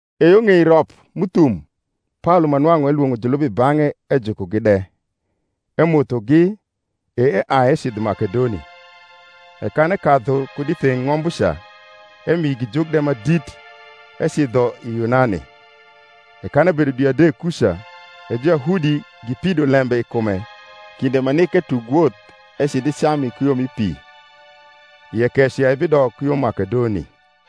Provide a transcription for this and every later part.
E yo ng’ei rop m’uthum Paolo ma nwang’u elwong’o julub i bang’e ejukogi de, emothogi, e eai ecidho i Makedoni. E kan ekadhu kud i theng’ ng’ombuca, emio igi juk de ma dit, ecidho i Yunani. E kan ebedo dwi adek kuca, e Juyahudi gipido lembe i kume kinde ma nik etug woth ecidh i Cami ku yo mi pi, ie keco ya ebidok ku yo Makedoni.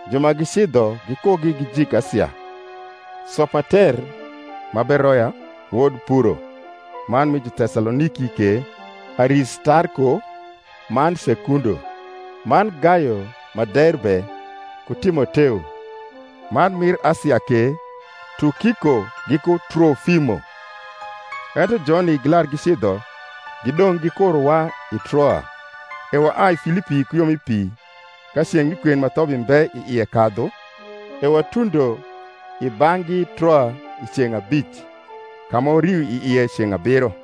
Ju ma gicidho gikugi gijik Asia, Sopater ma Beroya, wod Puro; man mi Jutesaloniki ke, Aristarko man Sekundo; man Gayo ma Derbe, ku Timoteo; man mir Asia ke, Tukiko giku Tronmo. Ento joni gilar gicidho, gidong’ gikurowa i Troa. E waai Filipi ku yo mi pi ka ceng’ mi kwen ma thobi mbe i ie kadhu, e watundo i bang’gi Troa i ceng’ abic; ka ma wario i ie ceng’ abiro.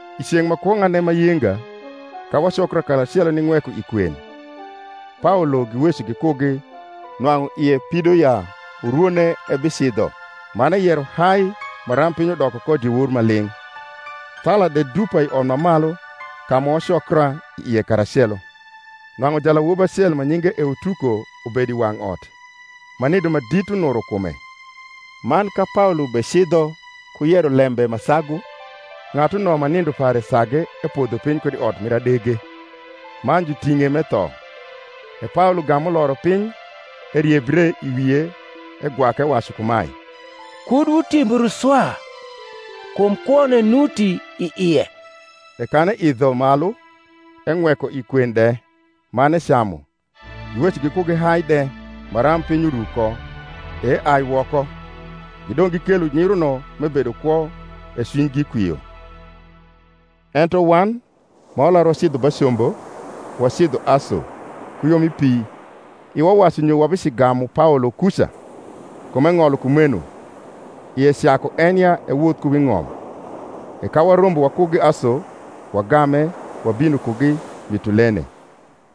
I ceng’ ma kwong’ane ma yenga, ka wacokra karacelo ning’weko i kwen, Paolo giweco gikugi, nwang’u ie pido ya urwone ebicidho; man eyero hai maram piny udoko ko diewor ma ling’. Thala de dupa i ot ma malu ka ma wacokra ie karacelo. Nwang’u jalawobi acel ma nyinge Eutuko ubedo i wang’ot, ma nindo ma dit unuro kume; man ka Paolo becidho ku yero lembe ma sagu, ng’atuno ma nindo pare sage epodho piny kud i ot mir adege, man juting’e m’etho. E Paolo gam uloro piny, eriebre i wie, egwake ewacu kumae, Kud wutimbru swa; kum kwone nuti i ie. E kan eidho malu, eng’weko i kwen de, man ecamu, giweco gikugi hai de, maram piny uru ko, e eai woko. Gidong’ gikelo nyiruno m’ebedo kwo, e cwinygi kwio. Ento wan, ma walar wacidho ba combo, wacidho Aso ku yo mi pi iwa wacu nyo wabicigamu Paolo kuca: kum eng’olo kumeno, ie caku en ya ewoth ku wi ng’om. E ka warombo wakugi Aso, wagame, wabino kugi Mitulene.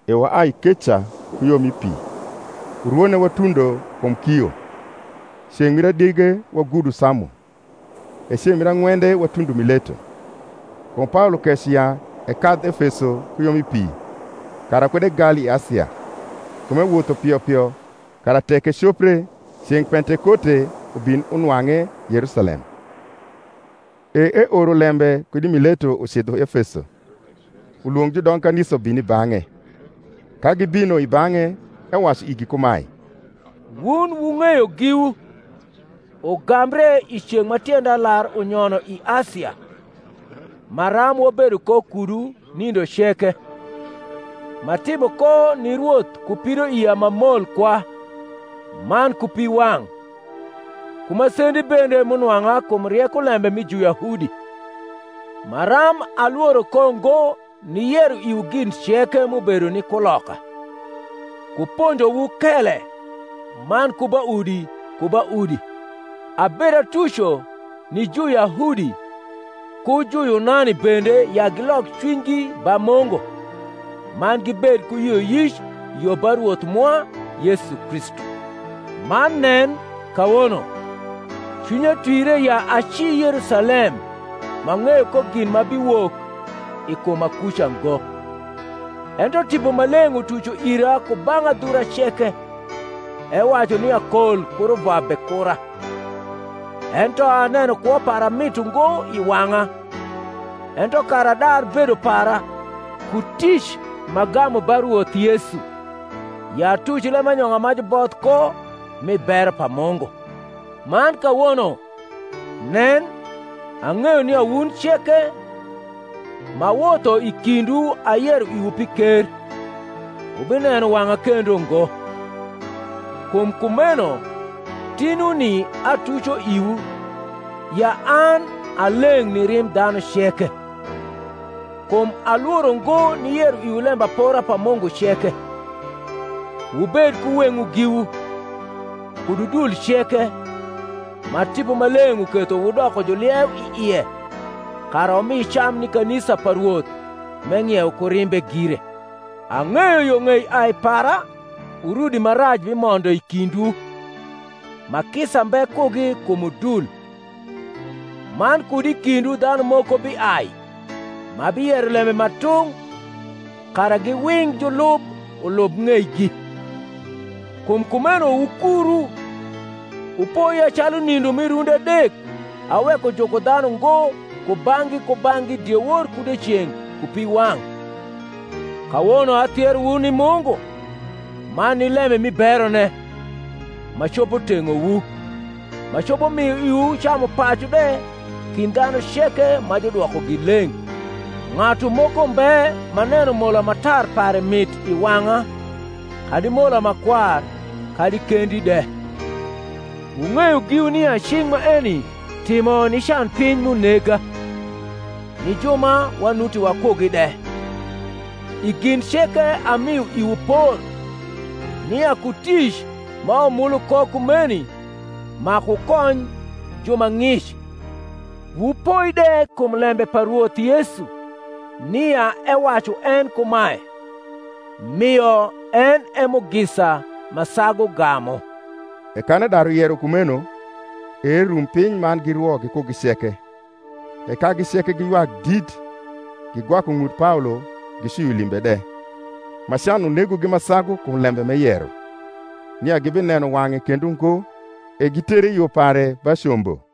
E waai keca ku yo mi pi, urwone watundo kum Kio; ceng’ mir adege wagudo Samo; e ceng’ mir ang’wende watundo Mileto. Kum Paolo keco ya ekadh Efeso ku yo mi pi, kara kud egal i Asia; kum ewotho pio pio, kara tek ecopre, ceng’ Pentekote ubin unwang’e Yerusalem. E eoro lembe kud i Mileto ucidho Efeso, ulwong’ judong kanisa ubin i bang’e. Ka gibino i bang’e, ewacu igi kumae, Wun wung’eyo giwu, ugambre i ceng’ ma tienda lar unyono i Asia, maram wabedo ko kudu nindo ceke, m’atimo ko ni Rwoth ku pidoia ma mol kwa, man ku piwang’, ku masendi bende m’unwang’a kum rieko lembe mi Juyahudi; maram alworo ko ngo niyero iwu gin ceke m’ubedo ni kuloka, ku ponjowu kele, man ku ba udi ku ba udi abedatuco ni Juyahudi ku Juyunani bende ya gilok cwinygi ba Mungu, man gibed ku yioyic yo ba Rwoth mwa Yesu Kristu. Man nen, kawono, cwinya twire ya aci Yerusalem m’ang’eyo ko gin ma biciwok i kuma kuca ngo: ento Tipo Maleng’ utuco ira ku bang’ adhura ceke, ewacu nia kol ku ruvwa bekura. Ento aneno kwo para mit ungo i wang’a, ento kara adar bedo para, ku tic m’agamu ba Rwoth Yesu, ya atuc lembanyong’a ma juboth ko mi bero pa Mungu. Man kawono, nen, ang’eyo nia wun ceke, m’awotho i kindwu ayero iwu pi ker, wubineno wang’a kendo ngo. Kum kumeno tinuni atuco iwu, ya an a leng’ ni rimb dhanu ceke. Kum alworo ngo niyero iwu lembapora pa Mungu ceke. Wubed ku weng’wu giwu, kud udul ceke, ma Tipo Maleng’ uketho wudoko julieu i ie kara wumi cam ni kanisa pa Rwoth m’eng’iewo ku rimbe gire. Ang’eyo yo ng’ei ai para urudi ma rac bimondo i kindwu, ma kisa mbe kugi kum udul; man kud i kindwu dhanu moko biai, ma biyero lembe ma tung’. kara giwing’ julub ulub ng’eigi. Kum kumeno wukuru, wupoi ya calu nindo mi rundi adek aweko juko dhanu ngo kubang’gi kubang’gi diewor ku dieceng’ ku piwang’. Kawono athierowu ni Mungu, man ni lembe mi berone, ma copo teng’owu, ma copo mio iwu camupacu de kind dhanu ceke ma judwokogi leng’. Ng’atu moko mbe m’aneno mola ma tar pare mit i wang’a, kadi mola ma kwar, kadi kendi de. Wung’eyo giwu nia cing’ maeni timo ni canpiny m’unega, ni ju ma wanuti wakugi de. I gin ceke amio iwu por, nia ku tic ma wumulu ko kumeni maku wukony ju ma ng’ic, wupoi de kum lembe pa Rwoth Yesu, nia ewacu en kumae, Mio en e mugisa ma sagu gamu. E kan edaru yero kumeno, e erum piny man girwo gikugi ceke. E kagi ceke giywak dit, gigwaku ng’ut Paolo gicwio limbe de, ma can unegogi ma sagu kum lembe m’eyero, nia gibineno wang’e kendo ngo. E gitere i yo pare ba combo.